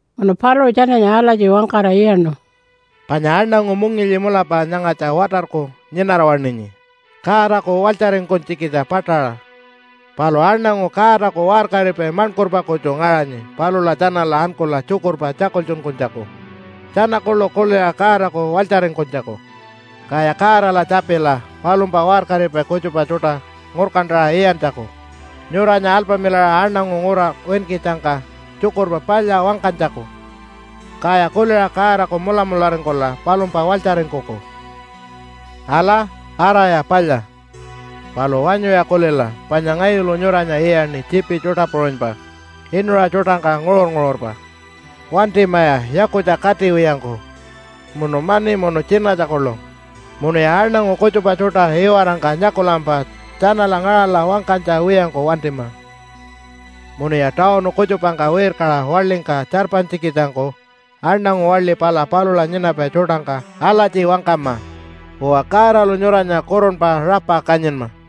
Munu paluṟu tjananya alatji wangkara iyaṉu, “Panya aṉangu mungilyi mulapa nyangatja watarku nyinara-waṉinyi Godaku walytjaringkunytjikitja paṯaṟa, palu aṉangu Godaku waṟkaripai maṉkurpa kutju ngaṟanyi palula tjanala ankula tjukurpa tjakultjunkunytjaku tjana kuḻu kuliṟa Godaku walytjaringkunytjaku. Kaya Godala tjapila palumpa waṟkaripai kutjupa tjuṯa ngurkantaṟa iyantjaku nyuranya alpamilaṟa aṉangu ngura winkitjangka Tjukurpa Palya wangkanytjaku. Kaya kuliṟa Godaku mulamularingkula palumpa walytjaringkuku. “Ala, araya palya. Palu wanyuya kulila panya ngayulu nyuranya iyaṉi tjiipi tjuṯa puṟunypa inuṟa tjuṯangka nguṟur-nguṟurpa. Wantimaya yakutja katiwiyangku munu mani munu tjinatja kuḻu, munuya aṉangu kutjupa tjuṯa iwarangka nyakulampa tjanala ngaṟala wangkanytja wiyangku wantima. “Munuya tawunu kutjupangka wirkaṟa waḻingka tjarpanytjikitjangku aṉangu waḻi pala palula nyinapai tjuṯangka alatji wangkama, ‘Uwa, Godalu nyuranya kurunpa rapa kanyinma.’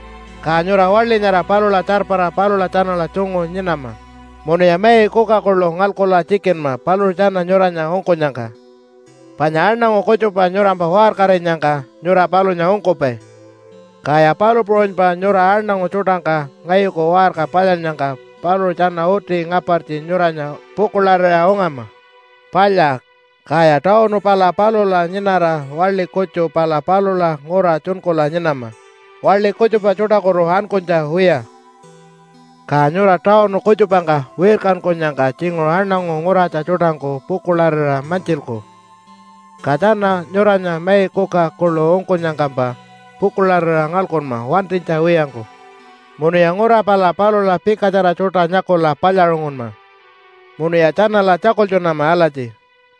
Ka nyura waḻi nyara palula tjarpara palula tjanala tjungu nyinama munuya mai kuka kuḻu ngalkula tjikinma paluṟu tjana nyuranya ungkunyangka. Panya aṉangu kutjupa nyurampa waṟkarinyangka nyura palunya ungkupai, kaya palu puṟunypa nyura aṉangu tjuṯangka ngayuku waṟka palyannyangka paluṟu tjana uti ngapartji nyuranya pukuḻarira ungama. Palya! Kaya tawunu pala palula nyinara, waḻi kutju pala palula ngura tjunkula nyinama waḻi kutjupa tjuṯakutu ankunytja wiya. “Ka nyura tawunu kutjupangka wirkankunyangka tjinguṟu aṉangu nguratja tjuṯangku pukuḻarira mantjilku, ka tjana nyuranya mai kuka kuḻu ungkunyangkampa pukuḻarira ngalkunma wantinytja wiyangku. Munuya ngura pala palula pikatjara tjuṯa nyakula palyaṟungunma munuya tjanala tjakultjunama alatji,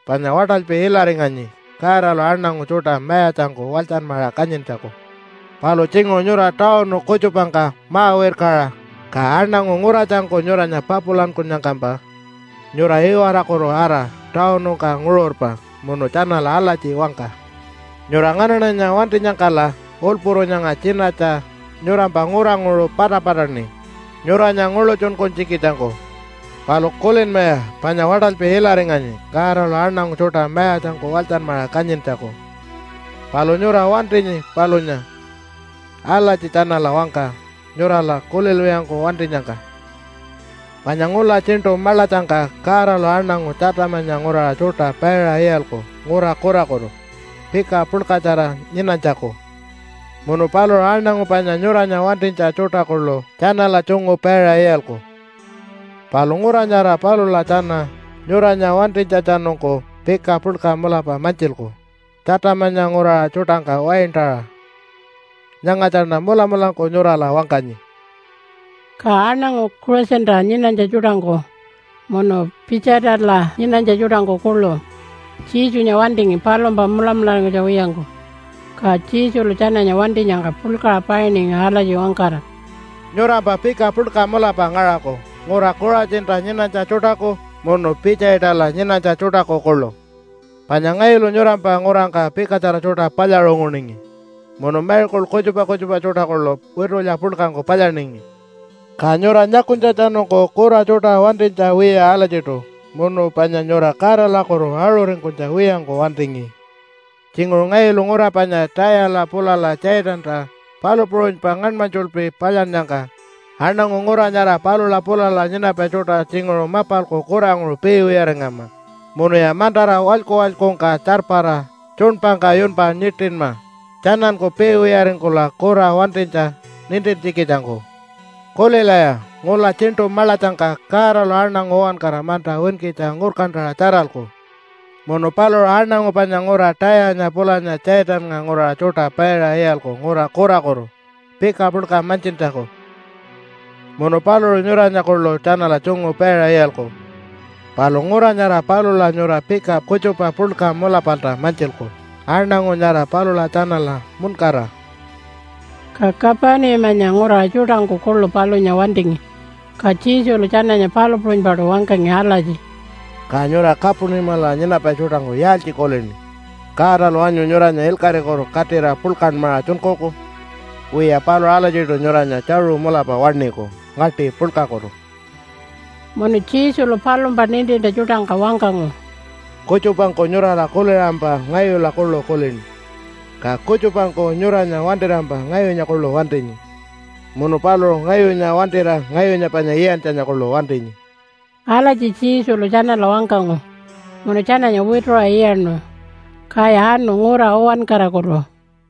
‘Panya waṯalpi ilaringanyi Godalu aṉangu tjuṯa mayatjangku walytjanmaṟa kanyintjaku.’ Palu tjinguṟu nyura tawunu kutjupangka ma-wirkaṟa ka aṉangu nguratjangku nyuranya papulankunyangkampa nyura iwarakutu ara tawunungka nguṟurpa munu tjanala alatji wangka, ‘Nyura nganaṉanya wantinyangkala ulpuru nyanga tjinatja nyurampa nguranguṟu patapataṉi nyuranya nguḻutjunkunytjikitjangku. Palu kulinmaya panya waṯalpi ilaringanyi Godalu aṉangu tjuṯa mayatjangku walytjanmaṟa kanyintjaku. Palu nyura wantinyi palunya.’ Alatji tjanala wangka nyurala kulilwiyangku wantinyangka. “Panya ngula Tjiṉṯu Maḻatjangka Godalu aṉangu Tjatamanya nguraṟa tjuṯa paiṟa iyalku ngura kurakutu pika puḻkatjara nyinanytjaku. Munu paluṟu aṉangu panya nyuranya wantinytja tjuṯa kuḻu tjanala tjungu paiṟa iyalku, palu ngura nyara palula tjana nyuranya wantinytjatjanungku pika puḻka mulapa mantjilku Tjatamanya nguraṟa tjuṯangka waintaṟa. Nyangatjaṉa mulamulangku nyurala wangkanyi.” Ka aṉangu Kuṟatjinta nyinanytja tjuṯangku munu Pitjaitala nyinanytja tjuṯangku kuḻu Jesunya wantingi palumpa mulamularingkunytja wiyangku. Ka Jesulu tjananya wantinyangka puḻkaṟa painingi alatji wangkara, “Nyurampa pika puḻka mulapa ngaṟaku ngura Kuṟatjinta nyinanytja tjuṯaku munu Pitjaitala nyinanytja tjuṯaku kuḻu, panya ngayulu nyurampa ngurangka pikatjara tjuṯa palyaṟunguningi munu miracle kutjupa kutjupa tjuṯa kuḻu witulya puḻkangku palyaningi, ka nyura nyakunytjatjanungku kura tjuṯa wantinytja wiya alatjiṯu munu panya nyura Godalakutu aṟuringkunytja wiyangku wantingi. Tjinguṟu ngayulu ngura panya Tayala pulala Tjaitanta palu puṟunypa ngaṉmanytjulpi palyannyangka, aṉangu ngura nyara palula pulala nyinapai tjuṯa tjinguṟu mapalku kuranguṟu piiwiyaringama, munuya mantara walyku-walykungka tjarpara tjuṉpangka yunpa nyiṯinma, tjananku piiwiyaringkula kura wantinytja nintintjikitjangku. Kulilaya! Ngula tjiṉṯu maḻatjangka Godalu aṉangu uwankara manta winkitja ngurkantaṟa tjaralku, munu paluṟu aṉangu panya ngura Tayanya pulanya Tjaitannga nguraṟa tjuṯa paiṟa iyalku ngura kurakutu pika puḻka mantjintjaku. Munu paluṟu nyuranya kuḻu tjanala tjungu paiṟa iyalku, palu ngura nyara palula nyura pika kutjupa puḻka mulapalta mantjilku aṉangu nyara palula tjanala muṉkara.” Ka Kapunimanya nguraṟa tjuṯangku kuḻu palunya wantingi, ka Jesulu tjananya palu puṟunypaṯu wangkangi alatji, “Ka nyura Kapunimala nyinapai tjuṯangku yaaltji kulini? Godalu wanyu nyuranya ilkaṟikutu katira puḻkanmaṟa tjunkuku? Wiya, paluṟu alatjiṯu nyuranya tjaṟu mulapa waṉiku ngaṯi puḻkakutu.” Munu Jesulu palumpa nintintja tjuṯangka wangkangu, “Kutjupangku nyurala kuliṟampa ngayula kuḻu kulini, ka kutjupangku nyuranya wantirampa ngayunya kuḻu wantinyi munu paluṟu ngayunya wantira ngayunya panya iyantjanya kuḻu wantinyi.” Alatji Jesulu tjanala wangkangu munu tjananya wituṟa iyaṉu. Kaya anu ngura uwankarakutu.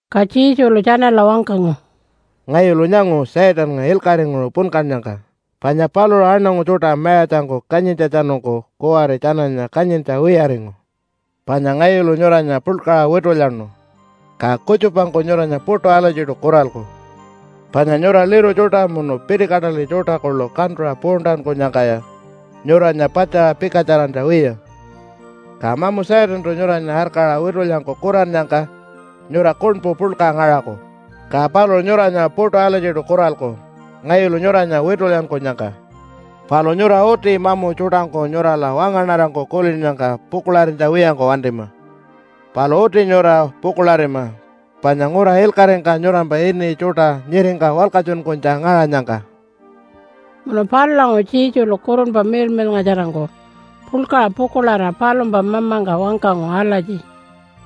Ka Jesulu tjanala wangkangu, “Ngayulu nyangu Satannga ilkaṟinguṟu punkannyangka, panya paluṟu aṉangu tjuṯa mayatjangku kanyintjatjanungku kuwari tjananya kanyintja wiyaringu. Panya ngayulu nyuranya puḻkaṟa witulyanu, ka kutjupangku nyuranya puṯu alatjiṯu kuralku. Panya nyura liru tjuṯa munu pitikataḻi tjuṯa kuḻu kantuṟa puuntankunyangkaya nyuranya patjaṟa pikatjarantja wiya. Ka mamu Satantu nyuranya arkaṟa witulyangku kurannyangka nyura kuṉpu puḻka ngaṟaku, ka paluṟu nyuranya puṯu alatjiṯu kuralku ngayulu nyuranya witulyankunyangka. Palu nyura uti mamu tjuṯangku nyurala wangaṉarangku kulinnyangka pukuḻarinytja wiyangku wantima, palu uti nyura pukuḻarima panya ngura ilkaṟingka nyurampa ini tjuṯa nyiringka walkatjunkunytja ngaṟanyangka.” Munu palulanguṟu Jesulu Kurunpa Miḻmiḻngatjarangku puḻkaṟa pukuḻarira palumpa mamangka wangkangu alatji,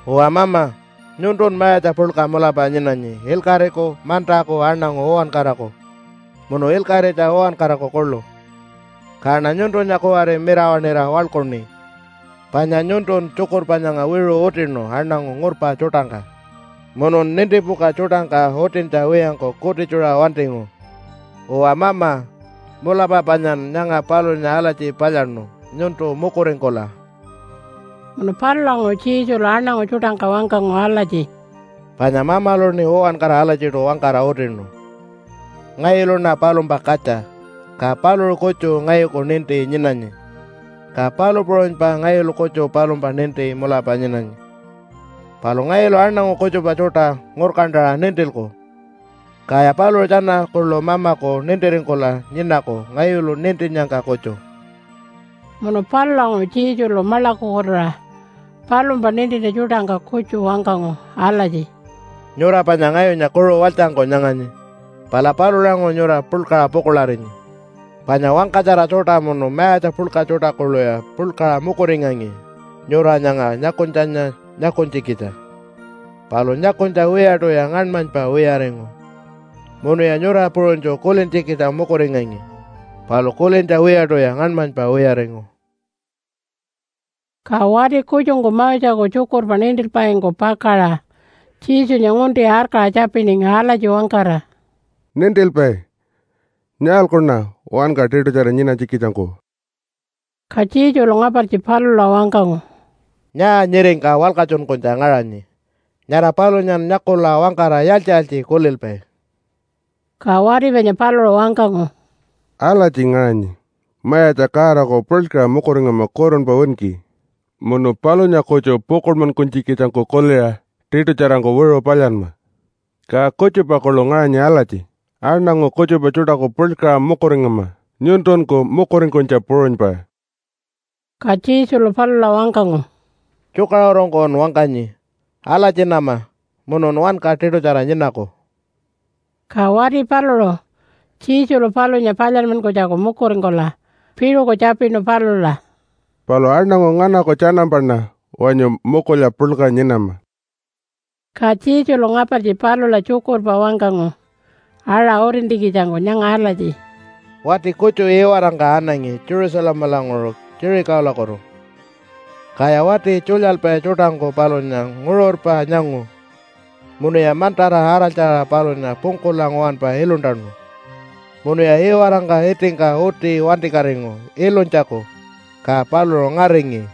“Uwa Mama, nyuntun Mayatja puḻka mulapa nyinanyi ilkaṟiku mantaku aṉangu uwankaraku munu ilkaṟitja uwankaraku kuḻu. Kaṉa nyuntunya kuwari mirawaṉira waḻkuṉi, panya nyuntun tjukurpa nyanga wiṟu utinu aṉangu ngurpa tjuṯangka munun nintipuka tjuṯangka utintja wiyangku kutitjuṟa wantingu. Uwa Mama, mulapa panyan nyanga palunya alatji palyaṉu nyuntu mukuringkula.” Munu palulanguṟu Jesulu aṉangu tjuṯangka wangkangu alatji, “Panya Mamaluṉi uwankara alatjiṯu wangkara utinu. Ngayuluṉa palumpa katja ka paluṟu kutju ngayuku ninti nyinanyi, ka palu puṟunypa ngayulu kutju palumpa ninti mulapa nyinanyi. Palu ngayulu aṉangu kutjupa tjuṯa ngurkantaṟa nintilku, kaya paluṟu tjana kuḻu Mamaku nintiringkula nyinaku ngayulu nintinnyangka kutju.” Munu palulanguṟu Jesulu maḻakukutuṟa palumpa nintintja tjuṯangka kutju wangkangu alatji, “Nyura panya ngayunya kuṟu walytjangku nyanganyi. Pala palulanguṟu nyura puḻkaṟa pukuḻarinyi. Panya wangkatjara tjuṯa munu mayatja puḻka tjuṯa kuḻuya puḻkaṟa mukuringangi nyura nyanga nyakunytjanya nyakunytjikitja, palu nyakunytja wiyaṯuya ngaṉmanypa wiyaringu. Munuya nyura puṟunytju kulintjikitja mukuringangi palu kulintja wiyaṯuya ngaṉmanypa wiyaringu.” Ka wati kutjungku Moseku tjukurpa nintilpaingku pakaṟa Jesunya ngunti arkaṟa tjapiningi alatji wangkara, “Nintilpai, nyaalkuṉa wanka tiṯutjara nyinanytjikitjangku?” Ka Jesulu ngapartji palula wangkangu, “Nyaa nyiringka walkatjunkunytja ngaṟanyi? Nyara palunyan nyakula wangkara yaaltji-yaaltji kulilpai?” Ka wati panya paluṟu wangkangu, “Alatji ngaṟanyi, ‘Mayatja Godaku puḻkaṟa mukuringama kurunpa winki, munu palunya kutju pukuḻmankunytjikitjangku kuliṟa tiṯutjarangku wiṟu palyanma.’ Ka kutjupa kuḻu ngaṟanyi alatji, ‘Aṉangu kutjupa tjuṯaku puḻkaṟa mukuringama nyuntunku mukuringkunytja puṟunypa.’” Ka Jesulu palula wangkangu, “Tjukaṟurungkun wangkanyi. Alatjinama munun wanka tiṯutjara nyinaku.” Ka wati paluṟu Jesulu palunya palyanmankunytjaku mukuringkula piṟuku tjapinu palula, “Palu aṉangu nganaku tjanampaṉa wanyu mukulya puḻka nyinama?” Ka Jesulu ngapartji palula tjukurpa wangkangu aṟa utintjikitjangku nyanga alatji, “Wati kutju iwarangka anangi Jerusalemalanguṟu Jericholakutu. Kaya wati tjulyalpai tjuṯangku palunya nguṟurpa nyangu munuya mantara araltjaṟa palunya pungkula nguwanpa iluntanu munuya iwarangka itingka uti wantikatingu ilunytjaku, ka paluṟu ngaringi.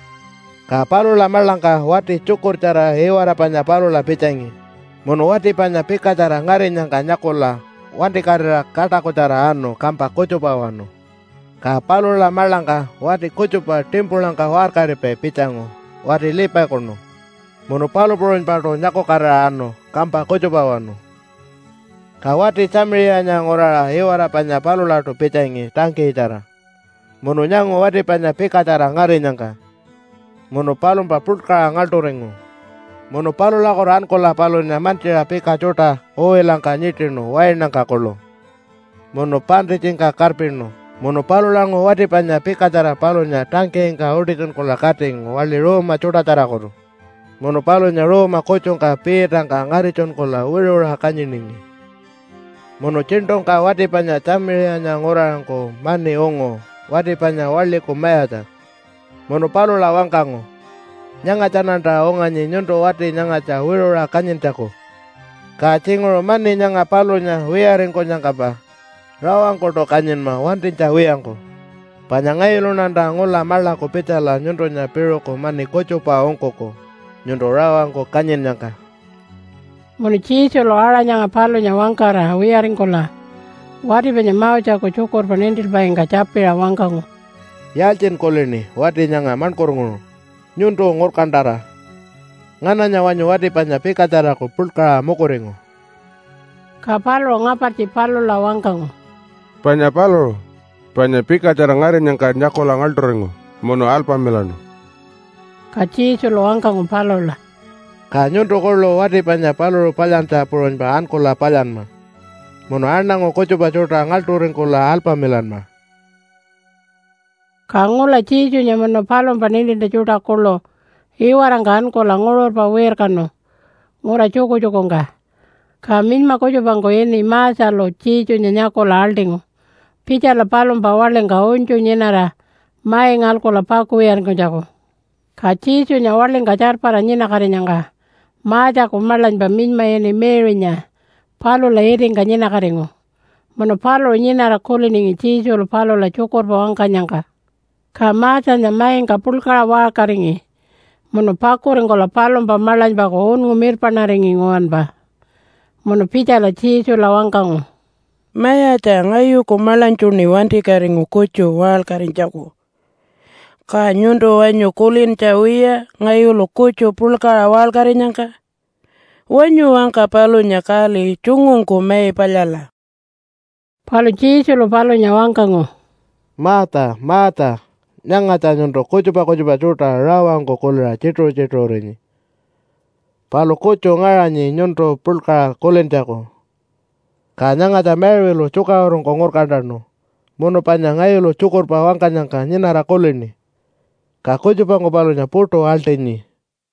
Ka palula maḻangka wati tjukurtjara iwara panya palula pitjangi munu wati panya pikatjara ngarinyangka nyakula wantikatira kaṯakutjara anu kampa kutjupawanu. Ka palula maḻangka wati kutjupa timpulangka waṟkaripai pitjangu wati Levikunu, munu palu puṟunypaṯu nyakukatira anu kampa kutjupawanu. “Ka wati Tjamiṟiyanya nguraṟa iwara panya palulaṯu pitjangi tangkiyitjara, munu nyangu wati panya pikatjara ngarinyangka munu palumpa puḻkaṟa ngaḻṯuringu. Munu palulakutu ankula palunya mantjiṟa pika tjuṯa uwilangka nyiṯinu wainangka kuḻu munu paṉṯitjingka karpinu. Munu palulanguṟu wati panya pikatjara palunya tangkiyingka utitjunkula katingu waḻi ruuma tjuṯatjarakutu munu palunya ruuma kutjungka piitangka ngaritjunkula wiṟuṟa kanyiningi. “Munu tjiṉṯungka wati panya Tjamiṟiyanya nguraṟangku mani ungu wati panya waḻiku mayatja. Munu palula wangkangu, ‘Nyangatjaṉanta unganyi nyuntu wati nyangatja wiṟuṟa kanyintjaku. Ka tjinguṟu mani nyanga palunya wiyaringkunyangkampa rawangkuṯu kanyinma wantinytja wiyangku, panya ngayuluṉanta ngula maḻaku pitjala nyuntunya piṟuku mani kutjupa ungkuku nyuntu rawangku kanyinnyangka.’” Munu Jesulu aṟa nyanga palunya wangkara wiyaringkula wati panya Moseku tjukurpa nintilpaingka tjapiṟa wangkangu, “Yaaltjin kulini wati nyanga maṉkurnguṟu? Nyuntu ngurkantara, ngananya wanyu wati panya pikatjaraku puḻkaṟa mukuringu?” Ka paluṟu ngapartji palula wangkangu, “Panya paluṟu, panya pikatjara ngarinyangka nyakula ngaḻṯuringu munu alpamilaṉu.” Ka Jesulu wangkangu palula, “Ka nyuntu kuḻu wati panya paluṟu palyantja puṟunypa ankula palyanma, munu aṉangu kutjupa tjuṯa ngaḻṯuringkula alpamilanma.” Ka ngula Jesunya munu palumpa nintintja tjuṯa kuḻu iwarangka ankula nguṟurpa wirkanu ngura tjukutjukungka. Ka minyma kutjupangku ini Marthalu Jesunya nyakula aḻṯingu pitjala palumpa waḻingka unytju nyinara mai ngalkula pakuwiyaringkunytjaku. Ka Jesunya waḻingka tjarpara nyinakatinyangka Marthaku maḻanypa minyma ini Mary-nya palula itingka nyinakatingu munu paluṟu nyinara kuliningi Jesulu palula tjukurpa wangkanyangka. Ka Marthanya maingka puḻkaṟa waṟkaringi munu pakuringkula palumpa maḻanypaku unngu mirpaṉaringi nguwanpa munu pitjala Jesula wangkangu, “Mayatja, ngayuku maḻanytjuṉi wantikatingu kutju waṟkarinytjaku. Ka nyuntu wanyu kulintja wiya ngayulu kutju puḻkaṟa waṟkarinyangka? Wanyu wangka palunya kali tjungungku mai palyala.” Palu Jesulu palunya wangkangu, “Martha, Martha! Nyangatja nyuntu kutjupa kutjupa tjuṯa rawangku kuliṟa tjituṟu-tjituṟurinyi. Palu kutju ngaṟanyi nyuntu puḻkaṟa kulintjaku. Ka nyangatja Mary-lu tjukaṟurungku ngurkantanu munu panya ngayulu tjukurpa wangkanyangka nyinara kulini, ka kutjupangku palunya puṯu aḻṯinyi.”